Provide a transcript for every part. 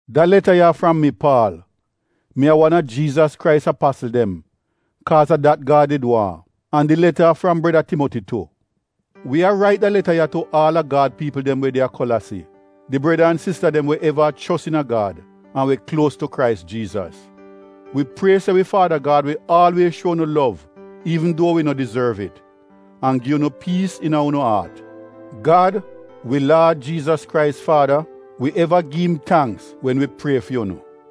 Da leta ya a fram mi, Paal. Mi a wan a Jiizas Krais Apasl dem kaaz a dat Gad did waahn. An di leta a fram breda Timoti tu. Wi a rait da leta ya tu aal a Gad piipl dem we de a Kolasi — di breda an sista dem we eva a chos iina Gad an we kluos tu Krais Jiizas: Wi prie se wi Faada Gad wi aalwiez shuo unu lov iivn duo wi no dizorv it, an gi unu piis iina unu aat. Gad, wi Laad Jiizas Krais faada, wi eva gi im tangks wen wi prie fi unu.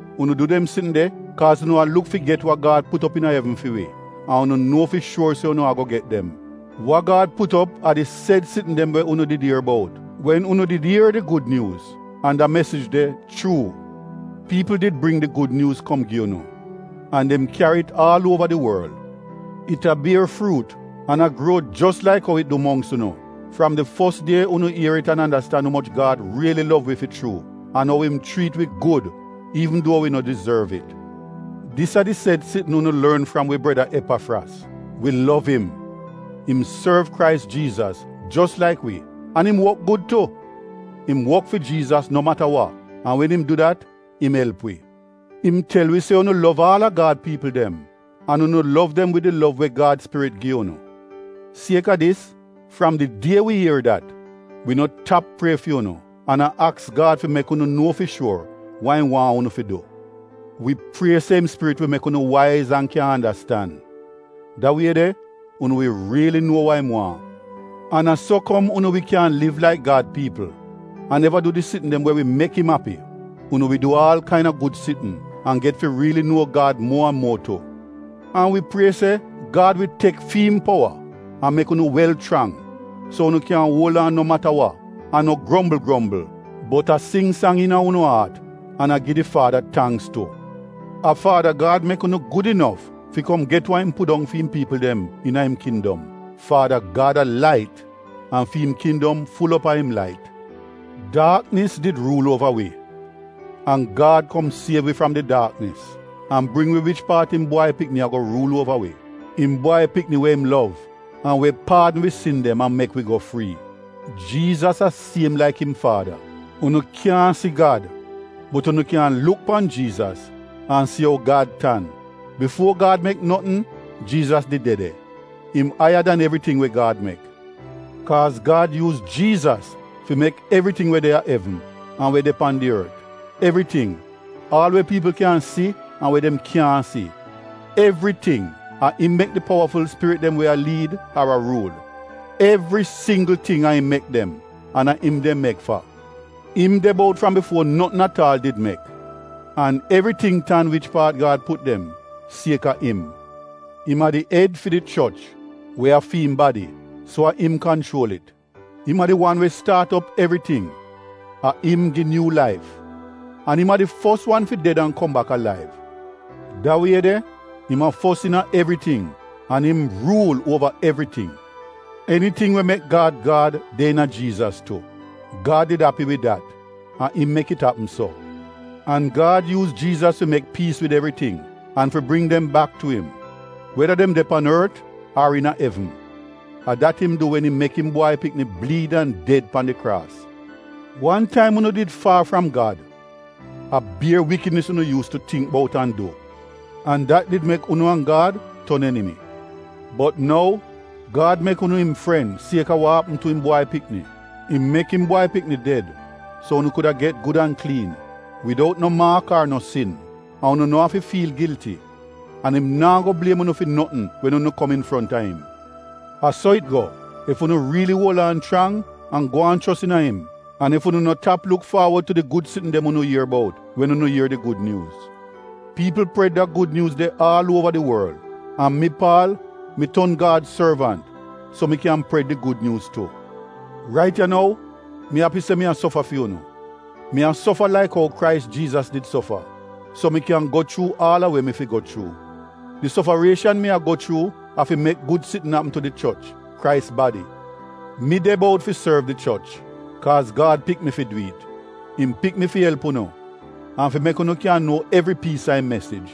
Unu du dem sitn de kaaz unu a luk fi get wa Gad put op iina evn fi wi, an unu nuo fi shuor se unu ago get dem. Wa Gad put op a di sed sitn dem we unu did ier bout wen unu did ier di Gud Nyuuz, an da mesij de chuu. Piipl did bring di Gud Nyuuz kom gi unu. An dem kyari it aal uova di worl. It a bier fruut an a gruo jos laik ou it du mongks unu fram di fos die unu ier it an andastan umoch Gad riili lov wi fi chuu, an ou im chriit wi gud iivn duo wi no dizorv it. Dis a di sed sitn unu lorn fram wi breda Epafras. Wi lov im. Im sorv Krais Jiizas, jos laik wi, an im wok gud tu. Im wok fi Jiizas no mata wa, an wen im du dat im elp wi. Im tel wi se unu lov aal a Gad piipl dem, an unu lov dem wid di lov we Gad Spirit gi unu. Sieka dis, fram di die wi ier dat, wi no tap prie fi unu an a aks Gad fi mek unu nuo fi shuor wa im waahn unu fi du. Wi prie se im Spirit wi mek unu waiz an kyan andastan. Da wie de unu wi riili nuo wa im waahn. An a so kom unu wi kyan liv laik Gad piipl an eva du di sitn dem we wi mek im api: Unu wi du aal kaina gud sitn, an get fi riili nuo Gad muo an muo tu. An wi prie se Gad wi tek fi im powa an mek unu wel chrang, so unu kyan uol aan no mata wa, an no grombl grombl, bot a sing sang iina unu aat an a gi di Faada tangks tu. A Faada Gad mek unu gud inof fi kom get wa im pudong fi im piipl dem iina im kindom. Faada Gad a lait an fi im kindom ful op a im lait. Daaknis did ruul uova wi, an Gad kom siev wi fram di daaknis an bring wi wich paat im Bwai Pikni ago ruul uova wi — im Bwai Pikni we im lov, an we paadn wi sin dem an mek wi go frii. Jiizas a siem laik im Faada. Unu kyaahn si Gad bot yu kyan luk pan Jiizas an si ou Gad tan. Bifuo Gad mek notn, Jiizas did de de. Im aiya dan evriting els we Gad mek. Kaaz Gad yuuz Jiizas fi mek evriting we de a evn an we de pan di ort: evriting — aal we piipl kyan si an we dem kyaahn si. Evriting — a im mek di powaful spirit dem we a liid, ar a ruul. Evri singgl ting a im mek dem an a im dem mek fa. Im de bout fram bifuo notn at aal did mek. An evriting tan wich paat Gad put dem sieka im. Im a di ed fi di choch, we a fi im badi, so a im kanchuol it. Im a di wan we staat op evriting — a im gi nyuu laif. An im a di fos wan fi ded an kom bak alaiv. Da wie de, im a fos iina evriting an im ruul uova evriting. Eniting we mek Gad Gad, de iina Jiizas tu. Gad did api wid dat; a im mek it apm so. An Gad yuuz Jiizas fi mek piis wid evriting an fi bring dem bak tu im, weda dem de pan ort ar iina evn. A dat im du wen im mek im Bwai Pikni bliid an ded pan di kraas. Wan taim unu did faar fram Gad. A bier wikidnis unu yuus tu tingk bout an du, an dat did mek unu an Gad ton enimi. Bot nou Gad mek unu im fren sieka wa apm tu im Bwai Pikni. Im mek im Bwai Pikni ded so unu kuda get gud an kliin, widout no maak ar no sin, an unu no afi fiil gilti, an im naa go bliem unu fi notn wen unu kom infronta im. A so it go, ef unu riili uol aan chrang an gwaan chos iina im, an ef unu no tap luk faawod tu di gud sitn dem unu ier bout wen unu ier di Gud Nyuuz. Piipl pred da Gud Nyuuz de aal uova di worl. An mi, Paal, mi ton Gad sorvant, so mi kyan pred di Gud Nyuuz tu. Rait ya nou, mi api se mi a sofa fi unu. Mi a sofa laik ou Krais Jiizas did sofa, so mi kyan go chuu aal a we mi fi go chuu. Di sofarieshan mi a go chuu a fi mek gud sitn apm tu di choch, Krais badi. Mi de bout fi sorv di choch, kaaz Gad pik mi fi du it. Im pik mi fi elp unu an fi mek unu kyan nuo evri piis a im mesij.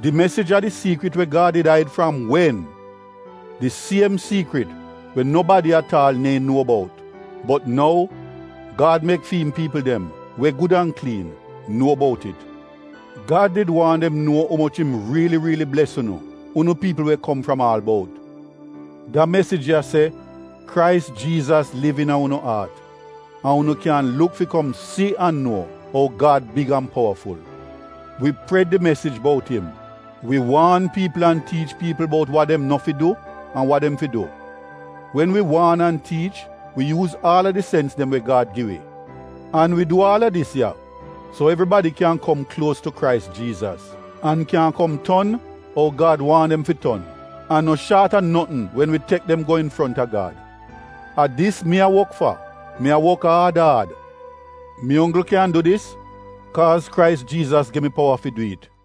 Di mesij a di siikrit we Gad did aid fram wen! Di siem siikrit we nobadi at aal neehn nuo bout. Bot nou, Gad mek fi im piipl dem, we gud an kliin, nuo bout it. Gad did waahn dem nuo umoch im riili riili bles unu — unu piipl we kom fram aal bout. Da mesij ya, se Krais Jiizas liv iina unu aat, an dat unu kyan luk fi kom si an nuo ou Gad big an powaful. Wi pred di mesij bout im. Wi waan piipl an tiich piipl bout wa dem no fi du an wa dem fi du. Wen wi waan an tiich, wi yuuz aal a di sens dem we Gad gi wi. An wi du aal a dis ya, so evribadi kyan kom kluos tu Krais Jiizas, an kyan kom ton ou Gad waahn dem fi ton, an no shaat notn wen wi tek dem go infronta Gad. A dis mi a wok fa. Mi a wok aad aad. Mi onggl kyan du dis kaaz Krais Jiizas gi mi powa fi du it.